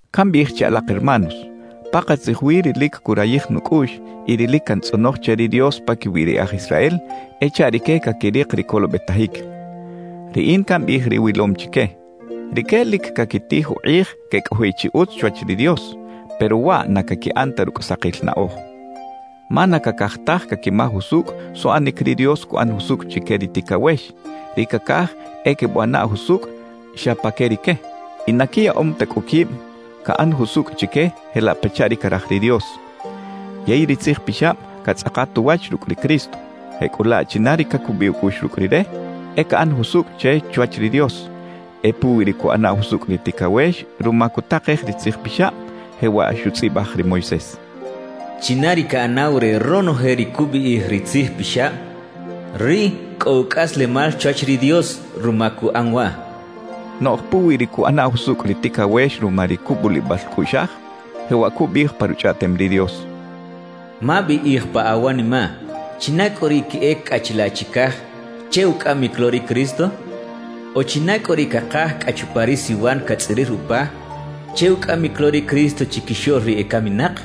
Cambiꞌij che alak hermanos, pakatzij wi ri lic curayij nucꞌuꞌx y ri lic cantzꞌonoj che ri Dios paquiwi ri e aj Israel e chaꞌ rique caquirik ri colobetajic. Riꞌin cambiꞌij ri wilom chique: Rique lic caquitij ukꞌij quecꞌojiꞌ chi utz chwach ri Dios, pero waꞌ na caquiꞌan ta rucꞌ sakil naꞌoj. Ma na cacaj taj caquimaj usucꞌ suꞌanic ri Dios cuꞌan jusucꞌ chique ri ticawex; ri cacaj e quebuꞌana jusucꞌ xa pa que rique. Y na quiyaꞌom ta cꞌu quib caꞌan jusucꞌ chique jelaꞌ pachaꞌ ri caraj ri Dios. Yey ri Tzij Pixab catzꞌakat uwach rucꞌ ri Cristo; jecꞌulaꞌ china ri cacubiꞌ ucꞌuꞌx rucꞌ Rire, e caꞌan jusucꞌ che chwach ri Dios. E puwi ri cuꞌana jusucꞌ ri ticawex ruma cutakej ri Tzij Pixab, jewaꞌ xutzꞌibaj ri Moisés: China ri caꞌanaw re ronoje ri cubiꞌij ri Tzij Pixab, riꞌ cꞌo ucꞌaslemal chwach ri Dios ruma cuꞌan waꞌ. Noꞌj puwi ri cuꞌana jusucꞌ ri ticawex ruma ri cubulibal cꞌuꞌxaj, jewaꞌ cubiꞌij pa Ruchꞌaꞌtem ri Dios: «Mabiꞌij pa awanimaꞌ: ¿China cꞌu ri queꞌec cꞌa chilaꞌ chicaj che ucꞌamic lo ri Cristo?» O «¿China cꞌu ri cakaj cꞌa chupa ri siwan catzꞌirir upa che ucꞌamic lo ri Cristo chiquixoꞌl ri ecaminak?»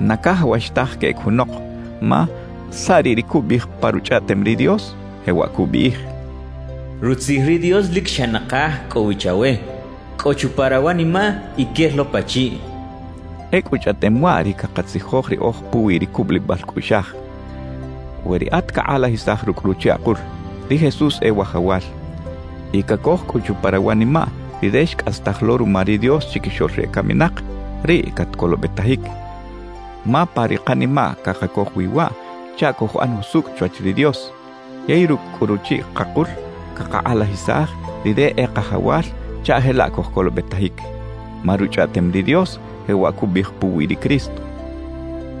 Na cajawax taj queꞌec junok, ma ¿saꞌ riꞌ ri cubiꞌij pa Ruchꞌaꞌtem ri Dios? Jewaꞌ cubiꞌij: Rutzij ri Dios lic xa nakaj cꞌo wi chawe. Cꞌo chupa rawanimaꞌ y quel lo pachiꞌ. Ecꞌu chꞌaꞌtem waꞌ ri cakatzijoj riꞌoj puwi ri cubulibal cꞌuꞌxaj: We riꞌat cakꞌalajisaj rucꞌ ruchiꞌ akul: «Ri Jesús e Wajawal» y cacoj cꞌu chupa rawanimaꞌ Rire xcꞌastaj lo ruma ri Dios chiquixoꞌl ri ecaminak, riꞌ catcolobetajic. Ma pa ri kanimaꞌ cakacoj wi waꞌ chaꞌ cojuꞌan jusucꞌ chwach ri Dios; yey rucꞌ cꞌu ruchiꞌ kakul, cakakꞌalajisaj Rire e Kajawal chaꞌ jelaꞌ cojcolobetajic. Ma Ruchꞌaꞌtem ri Dios jewaꞌ cubiꞌij puwi ri Cristo: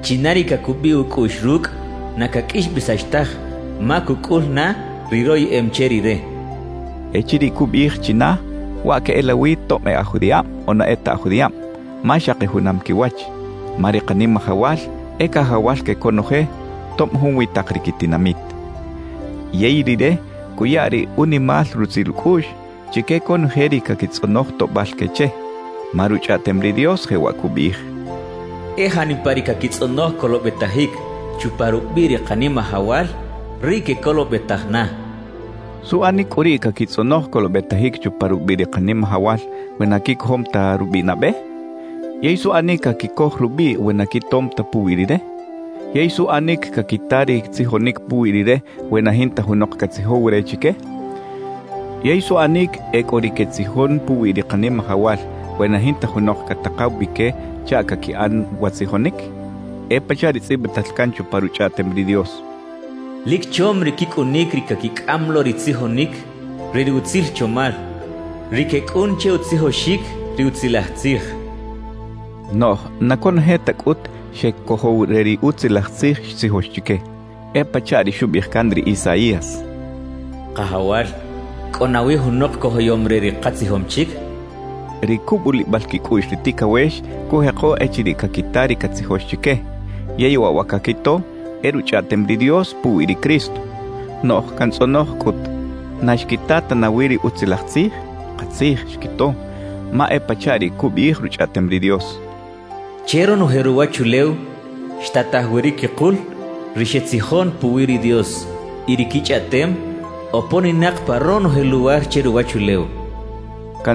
China ri cacubiꞌ ucꞌuꞌx rucꞌ, na caqꞌuixbesax taj ma cucꞌul na ri royeꞌem che Rire cachaꞌ. Echiriꞌ cubiꞌij «china», waꞌ queꞌelawi tob e aj judiꞌab o na e ta aj judiꞌab, ma xaki junam quiwach. Ma ri Kanimajawal e Cajawal que conoje, tob junwi tak ri quitinamit. Yey Rire cuya ri unimal rutzil ucꞌuꞌx chique conoje ri caquitzꞌonoj toꞌbal que che. Ma Ruchꞌaꞌtem ri Dios jewaꞌ cubiꞌij: E janipa ri caquitzꞌonoj colobetajic chupa rubiꞌ ri Kanimajawal, riꞌ quecolobetaj na cachaꞌ. ¿Suꞌanic cꞌu riꞌ caquitzꞌonoj colobetajic chupa rubiꞌ ri Kanimajawal we na quicojom ta rubiꞌ nabe? ¿Yey suꞌanic caquicoj rubiꞌ we na quitom ta puwi Rire? ¿Yey suꞌanic caquita ri tzijonic puwi Rire we na jinta junok catzijow re chique? ¿Yey suꞌanic e cꞌo ri quetzijon puwi ri Kanimajawal we na jinta junok catakaw bi que chaꞌ caquiꞌan wa tzijonic? E pachaꞌ ri tzꞌibital can chupa Ruchꞌaꞌtem ri Dios: ¡Lic chom ri quicꞌunic ri caquicꞌam lo ri tzijonic re ri utzil chomal, ri quecꞌun che utzijoxic ri Utzilaj Tzij! cachaꞌ. Noꞌj na conoje ta cꞌut xecojow re ri Utzilaj Tzij xtzijox chique. E pachaꞌ ri xubiꞌij can ri Isaías: Kajawal, ¿cꞌo nawi junok cojoyom re ri katzijom chic? xchaꞌ. Ri cubulibal quicꞌuꞌx ri ticawex cujeko echiriꞌ caquita ri catzijox chique; yey waꞌ wa caquito, e Ruchꞌaꞌtem ri Dios puwi ri Cristo. Noꞌj cantzꞌonoj cꞌut: ¿Na xquita ta nawi ri Utzilaj Tzij? ¡Katzij, xquito! Ma e pachaꞌ ri cubiꞌij Ruchꞌaꞌtem ri Dios: Che ronoje ruwachulew xtataj wi ri quikul ri xetzijon puwi ri Dios; y ri quichꞌaꞌtem oponinak pa ronoje luwar che ruwachulew cachaꞌ.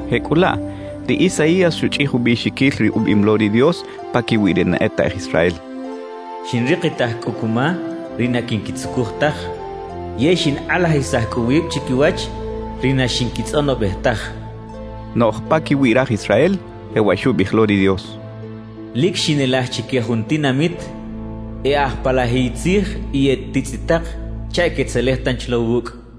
Jecꞌulaꞌ, ri Isaías xuchꞌij ubiꞌxiquil ri ubiꞌim lo ri Dios paquiwi ri na e ta aj Israel: Xinrikitaj cꞌu cuma ri na quinquitzucuj taj, yey xinkꞌalajisaj cꞌu wib chiquiwach ri na xinquitzꞌonobej taj xchaꞌ. Noꞌj paquiwi raj Israel, jewaꞌ xubiꞌij lo ri Dios: Lic xinelaj chique jun tinamit e aj palajiy tzij y e titzꞌitak chaꞌ quetzelej tanchi lo wucꞌ xchaꞌ.